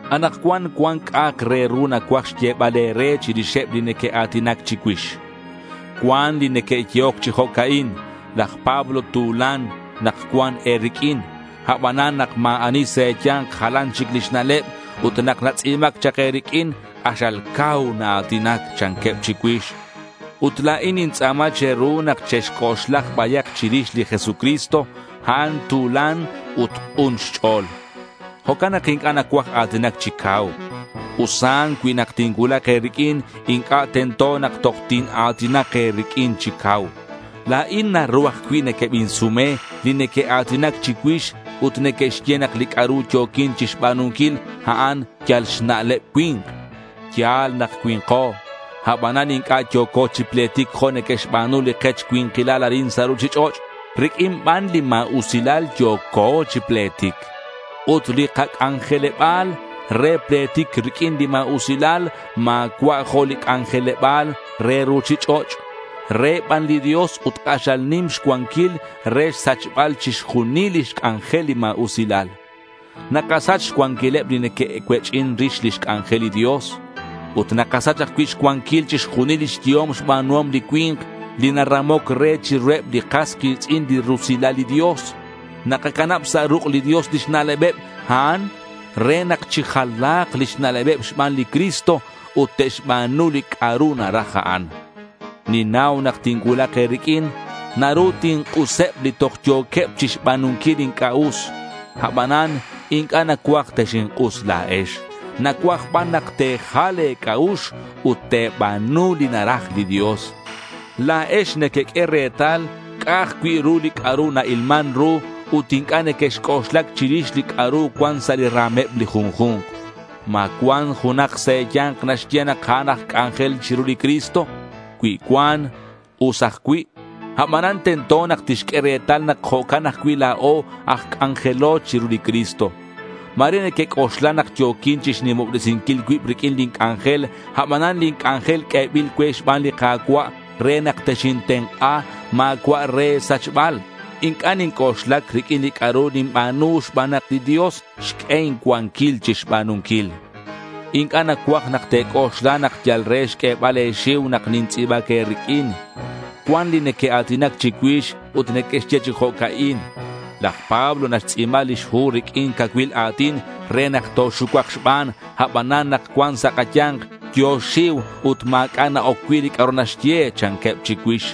Anakcuan cuan c'a'ak re ru nacuaj xyebal e̱re chirixeb li neque'a̱tinac chicuix. Cuan li neque'yehoc chi jo'ca'in: Laj Pablo tu̱lan nak cuan e̱riq'uin; abanan nak ma̱ ani sa' e̱ya̱nk jalan chic lix na'leb ut nak natz'i̱bac chak e̱riq'uin, k'axal cau naa̱tinac, chanqueb chicuix. Ut la̱in nintz'a̱ma che̱ru nak chexc'oxlak bayak chirix li Jesucristo. A'an tu̱lan ut k'un xch'o̱l. Jo'can nak inc'a' nacuaj a̱tinac chi cau. Usan cui nak tincuulak e̱riq'uin inc'a' tento nak toj tina̱tinak e̱riq'uin chi cau. La̱in naru ajcui' nequebinsume li neque'a̱tinac chicuix ut neque'xye nak li c'a'ru yo̱quin chixba̱nunquil, a'an yal xna'leb cui̱nk. Ya̱l nak cui̱nko. Abanan inc'a' yo̱co chi pletic jo' neque'xba̱nu li kech cui̱nkilal arin sa' ruchich'och'. Riq'uin ban li ma̱usilal yo̱co chi pletic. Ut li kac'anjeleba̱l re pletic riq'uin li ma̱usilal ma̱cua' jo' li c'anjeleba̱l re ruchich'och'. Re ban li Dios ut k'axal nim xcuanquil re xsachbal chixjunil lix c'anjel li ma̱usilal. Nakasach xcuanquileb li neque'cuech'in rix lix c'anjel li Dios. Ut nakasach ajcui' xcuanquil chixjunil lix yehom xba̱nuhom li cui̱nk li naramoc re chiruheb li kas ki̱tz'in li rusilal li Dios. Nakacanab sa' ruk' li Dios lix na'lebeb a'an re nak chijala̱k lix na'lebeb xban li Cristo ut te'xba̱nu li c'a'ru naraj a'an. Ninnau nak tincuulak e̱riq'uin naru tink'useb li toj yo̱queb chixba̱nunquil li inc'a' us. Abanan inc'a' nacuaj texink'us la̱ex. Nacuaj ban nak te̱jal le̱ c'a'ux ut te̱ba̱nu li naraj li Dios. La̱ex nequeq'ue retal ca'aj cui' li c'a'ru na-ilman ru ut inc'a' nequexc'oxlac chirix li c'a'ru cuan sa' li ra̱meb li junju̱nk. ¿Ma cuan junak sa' e̱ya̱nk naxye nak a'an aj c'anjel chiru li Cristo? Cui cuan, us ajcui'. Abanan tento nak tixq'ue retal nak jo'can ajcui' la̱o aj c'anjelo chiru li Cristo. Ma̱re nequec'oxla nak yo̱quin chixnimobresinquil cuib riq'uin lin c'anjel. Abanan lin c'anjel q'uebil cue xban li Ka̱cua' re nak texintenk'a. Ma̱cua' re e̱sachbal. Inc'a' ninc'oxlac riq'uin li c'a'ru ninba̱nu xban nak li Dios xq'ue incuanquil chixba̱nunquil. Inc'a' nacuaj nak te̱c'oxla nak yal re xq'uebal e̱xiu nak nintz'i̱bac e̱riq'uin. Cuan li neque'a̱tinac chicuix ut neque'xye chi jo'ca'in: Laj Pablo naxtz'i̱ba lix hu riq'uin cacuil a̱tin re nak toxucuak xban. Abanan nak cuan sa' kaya̱nk, yo̱ xxiu ut ma̱c'a' na-oc cui' li c'a'ru naxye, chanqueb chicuix.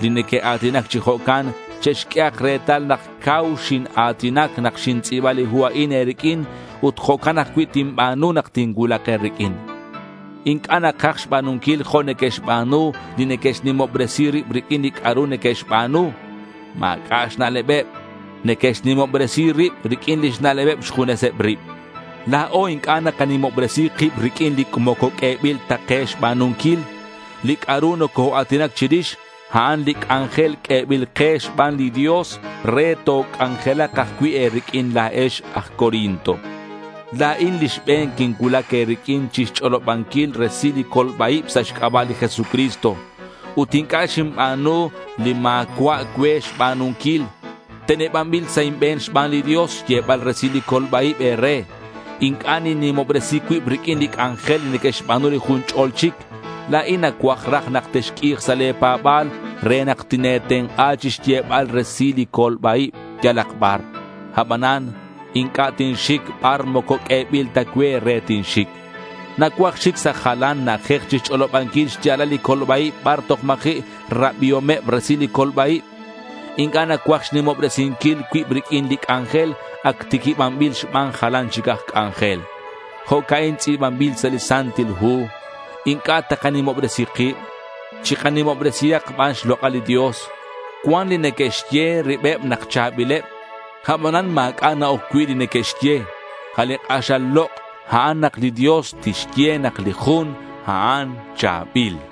Li neque'a̱tinac chi jo'can che'xq'uehak retal nak cau xina̱tinac nak xintz'i̱ba li hu a'in e̱riq'uin. Ut jo'can ajcui' tinba̱nu nak tincuulak e̱riq'uin. Inc'a' nakaj xba̱nunquil jo' neque'xba̱nu li neque'xnimobresi rib riq'uin li c'a'ru neque'xba̱nu. Ma̱c'a' xna'lebeb. Neque'xnimobresi rib riq'uin lix na'lebeb xjuneseb rib. La̱o inc'a' nakanimobresi kib riq'uin li moco q'uebil ta ke xba̱nunquil. Li c'a'ru nocoa̱tinac chirix, a'an li c'anjel q'uebil ke xban li Dios re toc'anjelak ajcui' e̱riq'uin la̱ex aj Corinto. La̱in li xbe̱n quincuulac e̱riq'uin chixch'olobanquil resil li colba-ib sa' xc'aba' li Jesucristo. Ut inc'a' xinba̱nu li ma̱cua' cue xba̱nunquil. Tenebanbil sa' inbe̱n xban li Dios xyebal resil li colba-ib e̱re. Inc'a' ninnimobresi cuib riq'uin li c'anjel li neque'xba̱nu li jun ch'ol chic. La̱in nacuaj raj nak texq'ui̱k sa' le̱ pa̱ba̱l re nak tine̱tenk'a chixyebal resil li colba-ib yalak bar. Abanan inc'a' tinxic bar moco q'uebil ta cue re tinxic. Nacuaj xic sa' jalan na'ajej chixch'olobanquil xya̱lal li colba-ib bar toj ma̱ji' xrabiomeb resil li colba-ib. Inc'a' nacuaj xnimobresinquil cuib riq'uin li c'anjel ac tiquibanbil xban jalan chic aj c'anjel. Jo'ca'in tz'i̱banbil sa' li Santil Hu: Inc'a' takanimobresi kib. Chikanimobresihak ban xlok'al li Ka̱cua'. Cuan li neque'xye ribeb nak cha̱bileb. Abanan ma̱c'a' na-oc cui' li neque'xye. A' li k'axal lok', a'an nak li Dios tixye nak li jun a'an cha̱bil.